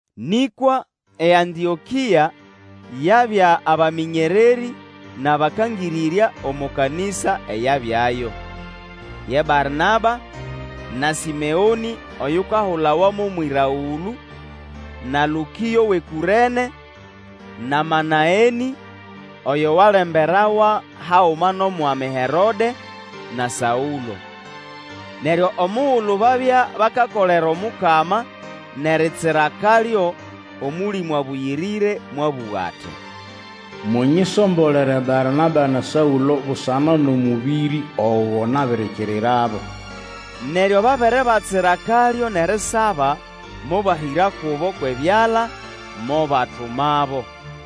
Nĩkwa eAntĩokĩa yabya abamĩnyererĩ nʼabakangĩrĩrya omo kanĩsa eyabyayo. Ye Barnaba, na Sĩmeonĩ oyukahulawa mo Mwĩragũlũ, na Lũkĩo wʼeKũrene, na Manaenĩ oyo walemberawa haguma nʼomwami Herode, na Saũlo. Neryo omugulu babya bakakolera Omukama nʼeritsira akalyo, Omũlĩmũ Abũyĩrĩre mwabũga ati, Munyisombolere Barnaba na Saũlo busana nʼomũbĩrĩ ogo nabirikirirabo. Neryo babere batsira akalyo nʼerisaba, mobahĩra kubo kwʼebyala, mobatumabo.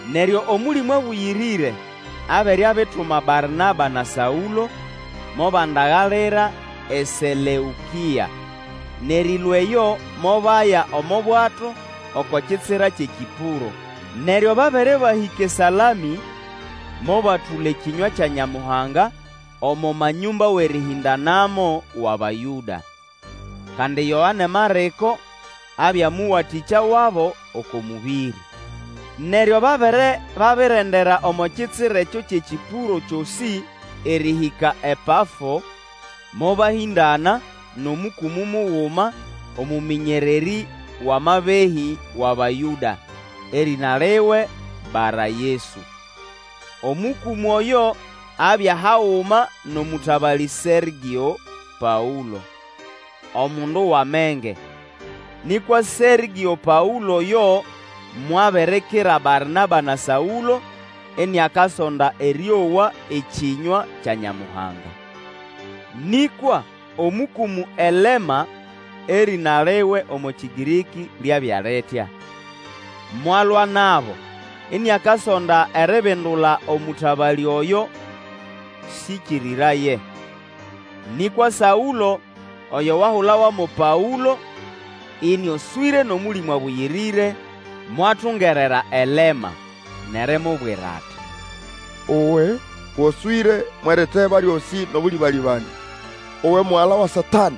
Neryo Omũlĩmũ Abũyĩrĩre abere abituma Barnaba na Saũlo, mobandagalira eSeleũkĩa, nʼerĩlũa eyo mobaya omo bwato oko kitsira kyʼeKĩpũro. Neryo babere bahĩka eSalamĩ, mobatũla ekĩnywa kya Nyamuhanga omo manyũmba wʼerĩhĩndanamo wʼAbayũda. Kandi Yoane Marĩko abya mũwatĩkya wabo oko mũbĩrĩ. Neryo babere babirendera omo kitsira ekyo kyʼeKĩpũro kyosĩ erĩhĩka ePafo, mobahĩndana nʼomũkũmũ muguma, omũmĩnyererĩ wʼamabehĩ wʼAbayũda, erĩna liwe Bara-Yesu. Omũkũmũ oyo abya haguma nʼomũtabalĩ Sergĩo Paũlo, omundu wʼamenge. Nĩkwa Sergĩo Paũlo oyo mwabirikira Barnaba na Saũlo iniakasonda erĩowa ekĩnywa kya Nyamuhanga. Nĩkwa omũkũmũ Elema (erĩna liwe omo Kĩgĩrĩkĩ lyabya litya) mwalwa nabo, iniakasonda eribindula omũtabalĩ oyo syĩkĩrĩraye. Nĩkwa Saũlo, oyo wahulawa mo Paũlo, ĩnĩoswĩre nʼOmũlĩmũ Abũyĩrĩre, mwatungerera Elema, nʼerimubwira ati, Uwe, goswĩre mwʼeriteba lyosĩ nʼobũlĩbalĩbanĩa, uwe mugala wʼeSatanĩ,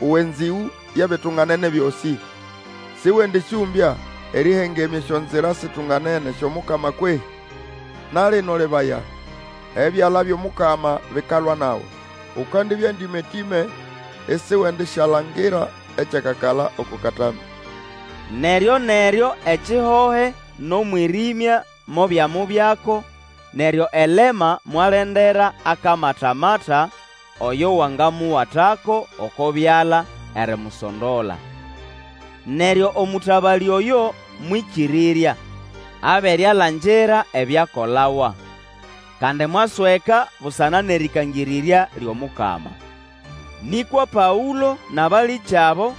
uwe nzĩgũ yʼebitunganene byosĩ! Sĩwendĩsyũmbya erĩhengemya esyonzira situnganene syʼOmukama kwehĩ? Na lino lebaya! ebyala byʼomukama bikalwa nawe, Ukandibya ndĩmatĩme isiwendisyalangira ekyakakala oko katambĩ. Neryoneryo ekihohe nʼomwĩrĩmya mobyamubyako, neryo Elema mwalendera akamatamata oyo wangamuwatako oko byala erimusondola. Neryo omũtabalĩ oyo mwĩkĩrĩrya, abere alangira ebyakolawa. Kandi mwasweka busana nʼerĩkangĩrĩrya lyʼomukama. Nĩkwa Paũlo nʼabalĩkyabo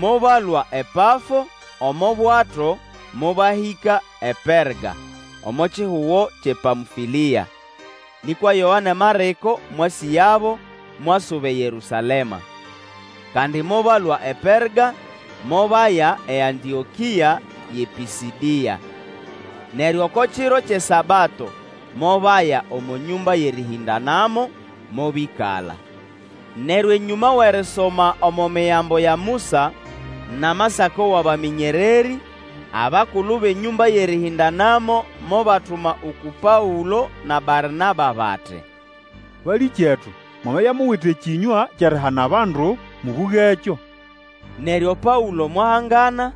mobalũa ePafo omo bwato mobahĩka ePerga omo kihugo kyʼePamfĩlĩa, nĩkwa Yoane Marĩko mwasĩgabo mwasuba eYerũsalema. Kandi mobalũa ePerga mobaya eAntĩokĩa yʼePĩsĩdĩa. Neryo oko kiro kyʼeSabato mobaya omo nyũmba yʼerĩhĩndanamo, mobĩkala. Neryo enyũma wʼerisoma omo Migambo ya Musa, nʼamasako wʼabamĩnyererĩ, abakulu bʼenyũmba yʼerĩhĩndanamo mobatuma uku Paũlo na Barnaba bati, Balĩkyetu, mwamabya muwite ekĩnywa kyʼerihana bandu, mũbũgekyo. Neryo Paũlo mwahangana,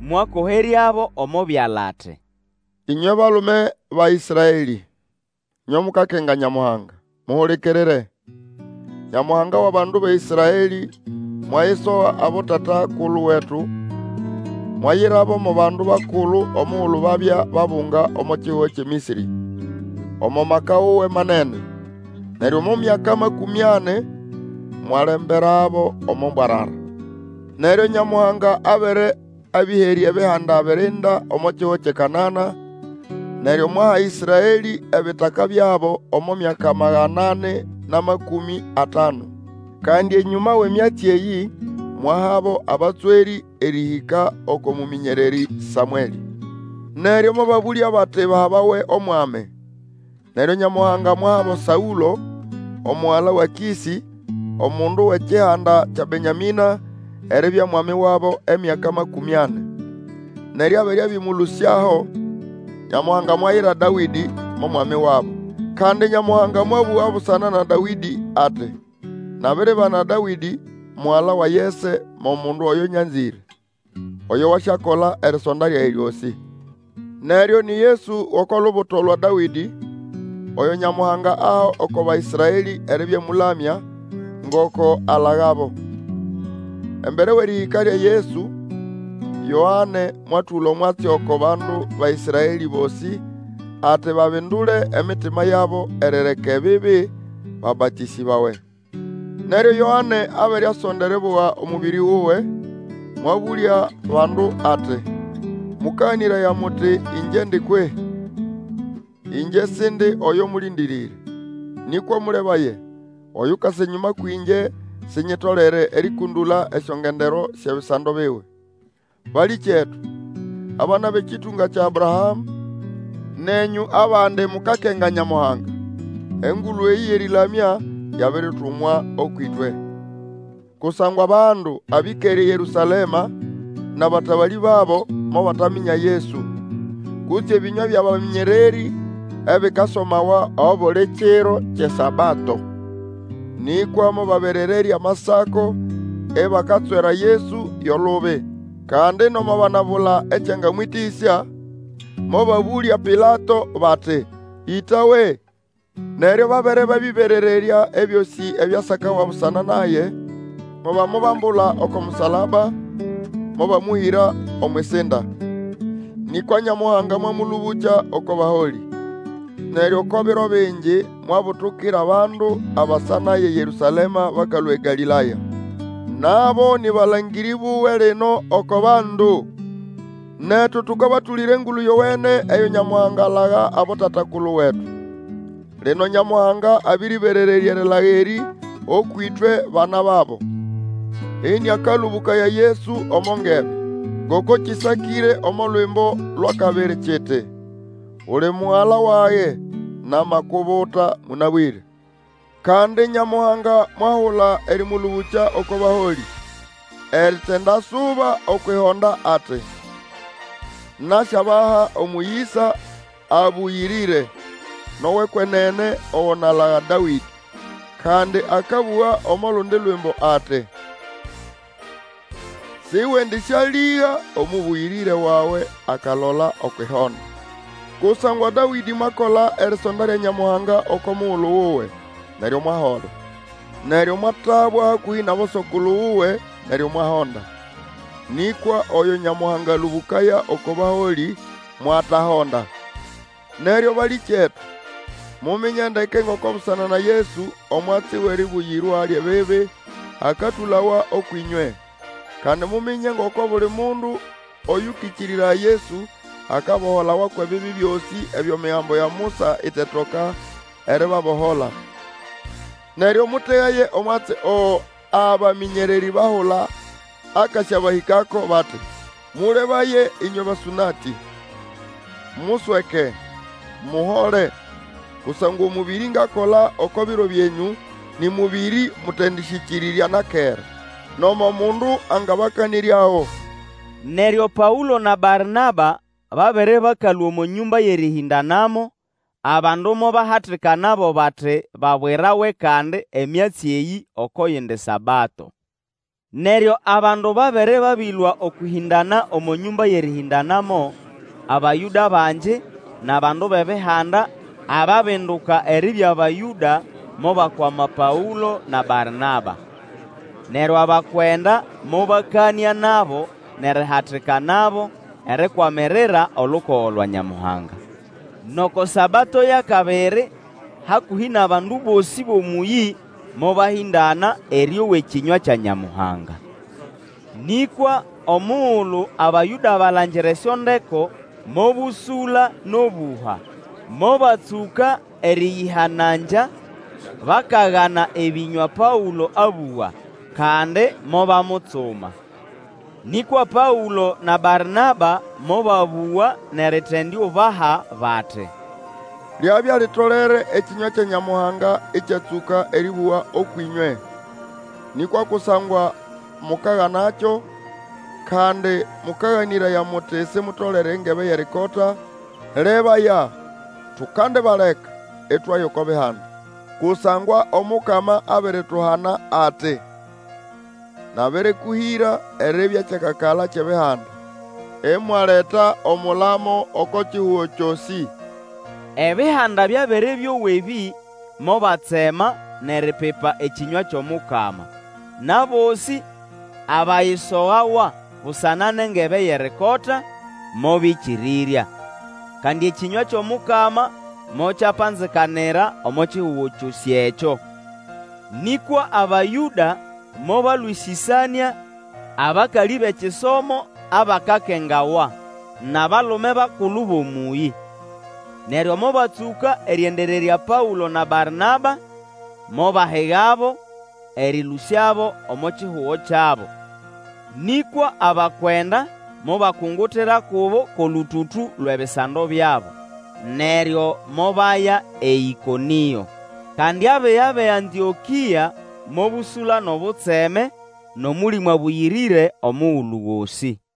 mwakoheryabo omo byala ati, Ĩnywe balume ba Ĩsraelĩ, ĩnywe mukakenga Nyamuhanga, muhulikirire! Nyamuhanga wʼabandu ba Ĩsraelĩ, mwayisoga abotata-kulu wetu, mwayirabo mo bandu bakulu omugulu babya babunga omo kihugo kyʼeMĩsĩrĩ, omo maka wuwe manene. Neryo omo myaka makũmĩ ani mwalemberabo omo mbwarara. Neryo Nyamuhanga abere abĩherya ebihanda birinda omo kihugo kyʼeKanana, neryo mwaha Ĩsraelĩ ebitaka byabo omo myaka magana ani nʼamakũmĩ atanu. Kandi enyũma wʼemyatsi eyĩ, mwahabo abatswerĩ erĩhĩka oko mũmĩnyererĩ Samwelĩ. Neryo mobabũlya bati bahabawe omwami, neryo Nyamuhanga mwahabo Saũlo omugala wa Kĩsĩ, omundu wʼekihanda kya Benyamĩna eribya mwami wabo emyaka makũmĩ ani. Neryo abere abĩmũlũsyaho, Nyamuhanga mwayira Dawĩdĩ mo mwami wabo. Kandi Nyamuhanga mwabũga busana na Dawĩdĩ ati, Nabiribana Dawĩdĩ mugala wa Yese mo mundu oyo nyanzĩre, oyo wasyakola erisonda lyage lyosĩ. Neryo ni Yesu wʼoko lubuto lwa Dawĩdĩ, oyo Nyamuhanga aha oko Baĩsraelĩ eribya Mũlamya, ngoko alagabo. Embere wʼerĩhĩka lya Yesu, Yoane mwatũla omwatsi oko bandu ba Ĩsraelĩ bosĩ, ati babindule emitima yabo erireka ebibi, babatĩsĩbawe. Neryo Yoane abere asonda eribuga omũbĩrĩ wuwe, mwabũlya bandu ati, Mũkaganĩraya muti Ĩngyendi kwehĩ? Ĩngye Sindi oyo mũlĩndĩrĩre. Nĩkwa mũlebaye! Oyukasa enyũma kwĩngye, sinyitolere erĩkũndũla esyongendero syʼebisando biwe. Balĩkyetu, abana bʼekĩtũnga kya Abrahamũ, nenyũ abandi mukakenga Nyamuhanga, engulu eyĩ yʼerĩlamya yabiritumwa ũkwʼĩtwe. Kusangwa bandu abĩkere eYerũsalema, nʼabatabalĩ babo, mobataminya Yesu, kutse ebĩnywa byʼabamĩnyererĩ ebikasomawa obuli kiro kyʼeSabato. Nĩkwa mobaberererya Amasako ibakatswera Yesu yo lubi. Kandi nomo banabula ekyangamwĩtĩsya, mobabũlya Pilato bati, Ĩtawe. Neryo babere babĩberererya ebyosĩ ebyasakawa busana naye, mobamubambula oko musalaba, mobamũhĩra omwʼisinda. Nĩkwa Nyamuhanga mwamũlũbũkya oko baholĩ. Neryo oko biro bingi mwabutukira abandu abasa naye eYerũsalema bakalũa eGalĩlaya. Nabo nĩ balangĩrĩ buwe lino oko bandu. Netu tũkabatũlĩra Engulu Yowene eyo Nyamuhanga alaga abotata-kulu wetu. Lino Nyamuhanga abĩrĩberererya erilaga erĩ ũkwʼĩtwe bana babo, ĩnĩakalũbũkaya Yesu omo ngebe. Ngoko kĩsakĩre omo Lwimbo lwʼakabiri kiti, Uli Mugala wage, Namakubuta mũnabwĩre. Kandi Nyamuhanga mwahula erĩmũlũbũkya oko baholĩ, Eritindasuba okwʼihonda ati, Nasyabaha omũyĩsa abũyĩrĩre nʼowʼekwenene Ogo nalaga Dawĩdĩ. Kandi akabũga omo lundi Lwimbo ati, Sĩwendĩsyalĩga Omũbũyĩrĩre wawe akalola okwʼihonda. Kusangwa Dawĩdĩ mwakola erisonda lya Nyamuhanga oko mugulu wuwe, neryo mwahola, neryo mwatabwa hakũhĩ nʼaboso-kulu wuwe, neryo mwahonda. Nĩkwa oyo Nyamuhanga alũbũkaya oko baholĩ mwatahonda. Neryo balĩkyetu, muminye ndeke ngoko busana na Yesu, omwatsi wʼeribuyirwa lyʼebibi akatũlawa ũkwʼĩnywe. Kandi muminye ngoko buli mundu Oyũkĩkĩrĩraya Yesu akaboholawa kwʼebibi byosĩ ebyo Migambo ya Musa itetoka eribabohola. Neryo mũtegaye omwatsi ogo abamĩnyererĩ bahula akasyabahĩkako, bati, Mũlebaye ĩnywe basũnatĩ! Musweke, muhole! Kusangwa omũbĩrĩ ngakola oko biro byenyu Nĩ mũbĩrĩ mũtendĩsyĩkĩrĩrya na kera, Nomo mundu angabakanĩryago! Neryo Paũlo na Barnaba babere bakalũa omo nyũmba yʼerĩhĩndanamo, abandu mobahatikanabo bati babwirawe kandi emyatsi eyĩ oko yindi Sabato. Neryo abandu babere babĩlũa okwʼĩhĩndana omo nyũmba yʼerĩhĩndanamo Abayũda bangi nʼabandu bʼEbihanda ababinduka eribya Bayũda, mobakwama Paũlo na Barnaba. Neryo abakwenda mobakanĩa nabo nʼerihatikanabo erikwamirira olukogo lwa Nyamuhanga. Nʼoko Sabato yʼakabiri hakũhĩ nʼabandu bosĩ bʼomũyĩ mobahĩndana erĩowa ekĩnywa kya Nyamuhanga. Nĩkwa omugulu Abayũda balangira esyondeko, mobũsũla nʼobũha, mobatsũka erĩyĩhanangya bakagana ebĩnywa Paũlo abũga, kandi mobamutsuma. Nĩkwa Paũlo na Barnaba mobabũga nʼeritendiubaha bati, Lyabya litolere ekĩnywa kya Nyamuhanga ĩkyatsũka erĩbũgwa ũkwʼĩnywe. Nĩkwa kusangwa mukaganakyo, kandi mũkaganĩraya muti Simutolere engebe yʼerikota, lebaya, tukandibaleka, itwaya oko Bihanda. Kusangwa Omukama abirituhana ati, Nabĩrĩkũhĩra eribya kyakakala kyʼEbihanda, Imwaleta omulamo oko kihugo kyosĩ. Ebihanda byabere byowa ebĩ, mobatsema nʼeripipa ekĩnywa kyʼomukama, nʼabosĩ abayisogawa busana nʼengebe yʼerikota, mobĩkĩrĩrya. Kandi ekĩnywa kyʼomukama mokyapanzikanira omo kihugo kyosĩ ekyo. Nĩkwa Abayũda mobalwĩsĩsanĩa abakalĩ bʼekisomo abakakengawa, nʼabalume bakulu bʼomũyĩ. Neryo mobatsũka erĩendererya Paũlo na Barnaba, mobahigabo, erĩlũsyabo omo kihugo kyabo. Nĩkwa abakwenda mobakungutira kubo kwʼolũtũtũ lwʼebisando byabo, neryo mobaya eĨkonĩo. Kandi abiga bʼeAntĩokĩa mobũsũla nʼobutseme nʼOmũlĩmũ Abũyĩrĩre omugulu gosĩ.